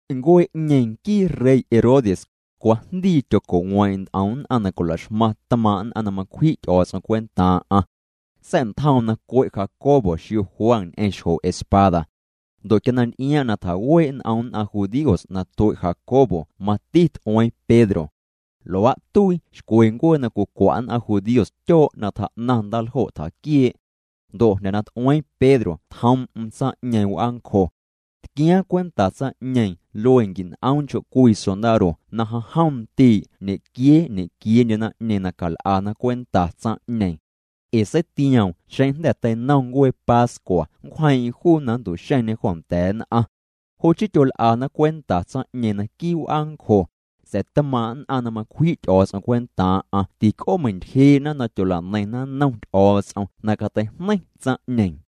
Ncuee'ñeeⁿ nquii rey Herodes, cwajndii tyoco'weeⁿ'eⁿ nt'om nn'aⁿ na cwilaxmaⁿ tmaaⁿ' nn'aⁿ na macwji' Ty'o̱o̱ts'om cwentaaⁿ'aⁿ. Sa̱'ntjoom na cue' Jacobo xio Juan ñ'eⁿ xjo espada. Ndo' quia na nty'iaaⁿ'aⁿ na tjawee' n'om nn'aⁿ judíos na tue' Jacobo mati t'ueeⁿ Pedro. Luaa' tuii xcwe ncuee na cwicwa' nn'aⁿ judíos tyoo' na tjaa'naⁿ ndaaljo' tjaquiee'. Ndo' jnda̱ na t'ueeⁿ Pedro tjoom'm tsaⁿ'ñeeⁿ w'aancjo. Tquiaaⁿ cwenta tsaⁿ'ñeeⁿ luee quin'oom nchoo' cwii sondaro na jom jom ndii' ñequiee ñequieendye naⁿ'ñeeⁿ na cal'ana cwenta tsaⁿ'ñeeⁿ. Ee seitioom xeⁿ jnda̱ teinom ncuee pascua nncwjeeⁿ'eⁿ juu na nntu'xeⁿñe joo nda̱a̱ nn'aⁿ. Jo' chii tyol'ana cwenta tsaⁿ'ñeeⁿ naquii' w'aancjo, sa̱a̱ tmaaⁿ' nn'aⁿ na macwji' Ty'o̱o̱ts'om cwentaaⁿ'aⁿ tic'oomeintyjee'na na tyola'neiⁿna nnom Ty'o̱o̱ts'om na cateijneiⁿ tsaⁿ'ñeeⁿ.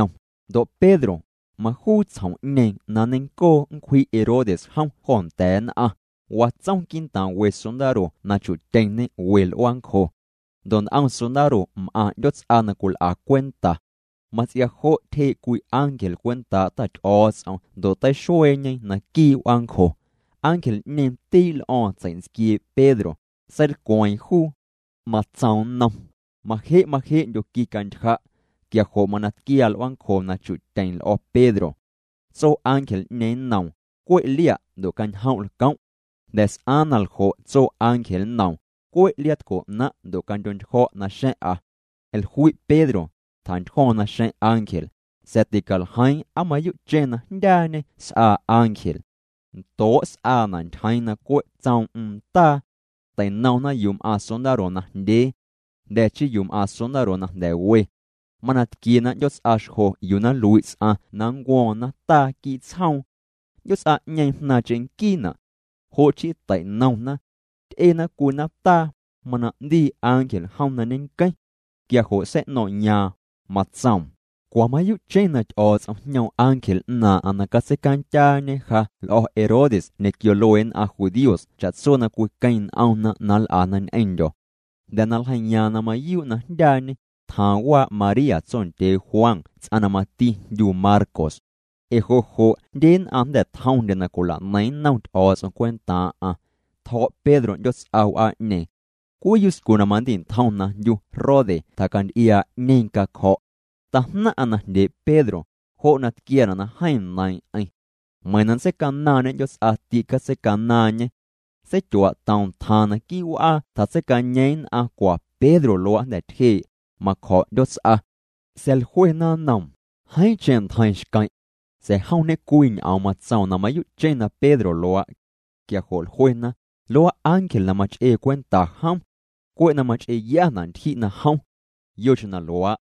Ndo' Pedro, majuu tsjom'ñeeⁿ na nneiⁿncoo nncwji' Herodes jom jo nda̱a̱ nn'aⁿ, watsom quii'ntaaⁿ we sondaro na chu'tyeⁿñê we l'uaancjo. Ndo' nt'om sondaro m'aⁿ 'ndyoots'a na cwil'a cwenta. Mats'ia jo' tyjee' cwii ángel cwentaa' Ta Ty'o̱o̱ts'om ndo' teixueeñe naquii' w'aancjo. Ángel'ñeeⁿ tii' l'o̱o̱ⁿ tsei'ntsquiee' Pedro, seilcweeⁿ juu. Matsoom nnom: —Maje' maje'ndyo quicantyja'. Quia jo' mana tquiaa l'uaancjo na chu'tyeⁿ l'o̱ Pedro. Tso ángel'ñeeⁿ nnoom: —Cwe' lia' ndo' cañjom' lcom'. Jnda̱ s'aaⁿ na ljo' tso ángel nnoom: —Cwe' liaatco 'naⁿ' ndo' candyo'ntyjo̱' naxa̱ⁿ'a. Jlui' Pedro, tjantyjo̱o̱ⁿ naxeⁿ' ángel, sa̱a̱ ticaljeiiⁿ aa mayuu'cheⁿ na jndyaañê s'aa ángel. Ndoo' s'aana' ntyjeeⁿ na cwe' tsoom'm ndaa. Tei'nomna yuu m'aaⁿ sondaro najndyee. Jnda̱ chii yuu m'aaⁿ sondaro na jnda̱ we. Mana tquiena 'ndyoots'a xjo yuu na nlui' ts'aⁿ na nncuo̱o̱ⁿ nataa quii' tsjoom. 'Ndyoots'a'ñeeⁿ jnaaⁿ cheⁿnquiina'. Jo' chii tei'nomna. Ty'ena cwii nataa, mana 'ndii ángel jom na ñeⁿnqueⁿ. Quia jo' sei'no̱ⁿ'yaaⁿ, matsoom: —Cwa mayuu'cheⁿ na Ty'o̱o̱ts'om jñoom ángel 'naaⁿ'aⁿ na catseicandyaañe ja l'o̱ Herodes ñequio luee nn'aⁿ judíos cha'tso na cwiqueⁿ n'omna na nl'ana ñ'eⁿndyo̱. Jnda̱ na ljeiiyaaⁿ na mayuu' na jndyaañê, tjaaⁿ waa' María tsondyee Juan ts'aⁿ na mati jndyu Marcos. Ee jo' jo' jndye nn'aⁿ jnda̱ tjomndye na cwila'neiⁿ nnom Ty'o̱o̱ts'om cwentaaⁿ'aⁿ. Tjo̱' Pedro 'ndyoots'a w'aa'ñeeⁿ. Cwii yuscu na mandi'ntjom na jndyu Rode tjacanty'iaa' 'ñeeⁿ cacjo̱'. Tajnaⁿ'aⁿ na jndyee' Pedro, jo' na tquiaana' na jeeⁿ neiiⁿ'eⁿ. Meiⁿ na nntseicanaaⁿñê 'ndyoots'a tîcatseicanaaⁿñê. Seityuaa'toom tjaaⁿ naquii' w'aa tjatseicañeeⁿ nn'aⁿ cwa Pedro luaa' jnda̱ tyjee', macjo̱' 'ndyoots'a. Sa̱a̱ jluena nnoom: —Jeeⁿcheⁿ ntjeiⁿ xqueⁿ'. Sa̱a̱ jom ñe'cwii ñ'oom matsoom na mayuu'cheⁿ na Pedro luaa'. Quia jo' jluena: —Luaa' ángel na mach'ee cwenta jom. Cwe' na mach'eeyana' ntyji' na jom. Yocheⁿ na luaa',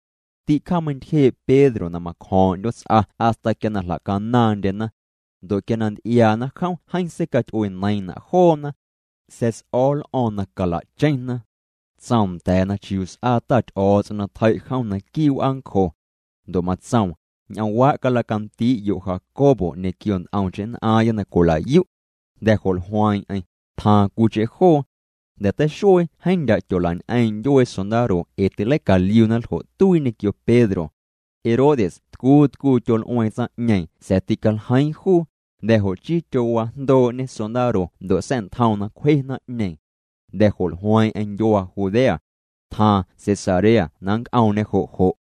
tîcjaameiⁿntyjee' Pedro na macjo̱o̱ⁿ'o̱ⁿ 'ndyoots'a hasta quia na jlacanaaⁿndyena. Ndo' quia nty'iaana jom jeeⁿ seicaty'ueneiiⁿ'na' joona. Sa̱a̱ s'o̱o̱ l'o̱o̱ⁿ na calacheⁿna. Tsoom nda̱a̱na chiuu s'aa Ta Ty'o̱o̱ts'om na tjei' jom naquii' w'aancjo. Ndo' matsoom: —Ñ'oomwaa' calacandii'yo' Jacobo ñequio nt'omcheⁿ nn'aaⁿya na cwilayu'. Jnda̱ jo' jlueeⁿ'eⁿ, tjaaⁿ cwiicheⁿ joo. Jnda̱ teixuee jeeⁿ ndyaa' tyolañ'eeⁿ' ndyuee sondaro ee tîleicaliuna ljo' tuii ñequio Pedro. Herodes tcuu tcuu tyol'ueeⁿ tsaⁿ'ñeeⁿ sa̱a̱ tîcaljeiiⁿ juu, Jnda̱ jo' chii tyowajndooñê sondaro ndo' sa̱'ntjoom na cwje naⁿ'ñeeⁿ. Jnda̱ jo' jlueeⁿ'eⁿ ndyuaa Judea. Tjaaⁿ Cesarea na nnc'oomñê jo' jo'.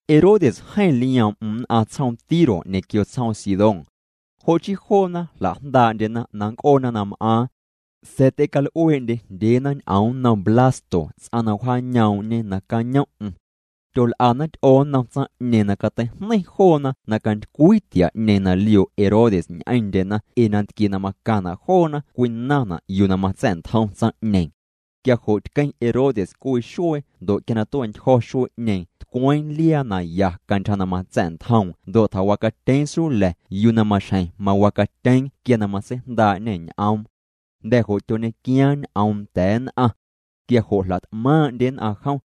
Herodes jeeⁿ lioom'm nn'aⁿ tsjoom Tiro ñequio tsjoom Sidón. Jo' chii joona jlajndaa'ndyena na nnc'oona na m'aaⁿ. Sa̱a̱ ty'ecal'ueendye jndyeena ñ'oom nnom Blasto ts'aⁿ na wjaañoom'ñe nacañom'm. Tyol'ana ty'oo nnom tsaⁿ'ñeeⁿ na cateijneiⁿ joona na cantycwii tia'ñeeⁿ na lioo' Herodes ñ'eⁿndyena ee nantquie na macaⁿna' joona cwinaⁿna' yuu na matsa̱'ntjom tsaⁿ'ñeeⁿ. Quia jo' tqueⁿ Herodes cwii xuee ndo' quia na tue'ntyjo̱ xuee'ñeeⁿ tcweeⁿ liaa na ya cantyja na matsa̱'ntjoom ndo' tjawacatyeeⁿ sula̱ yuu na maxjeⁿ mawacatyeeⁿ quia na matseijndaa'ñê ñ'oom. Jnda̱ jo' tyoñequiaaⁿ ñ'oom nda̱a̱ nn'aⁿ. Quia jo' jlat'maaⁿ'ndye nn'aⁿ jom.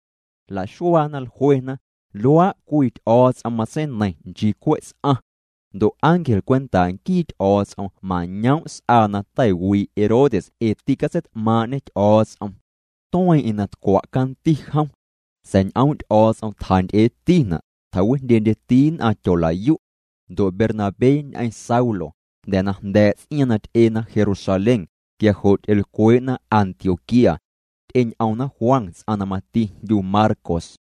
Jlaxuaana, jluena: —Luaa' cwii ty'o̱o̱ts'om matseineiiⁿ nchii cwe' ts'aⁿ. Ndo' ángel cwentaa' nquii Ty'o̱o̱ts'om mañoom' s'aa na teiwii' Herodes ee tîcatseit'maaⁿ'ñê Ty'o̱o̱ts'om. Tueeⁿ'eⁿ na tcwa' canti jom. Sa̱a̱ ñ'oom' Ty'o̱o̱ts'om tjanty'eetina', tjawijndyendyeti nn'aⁿ tyolayu'. Ndo' Bernabé ñ'eⁿ Saulo, jnda̱ na jnda̱a̱' ts'iaaⁿ na ty'ena Jerusalén, quia jo' ty'elcwee'na Antioquía. Ty'eñ'omna Juan ts'aⁿ na mati jndyu Marcos.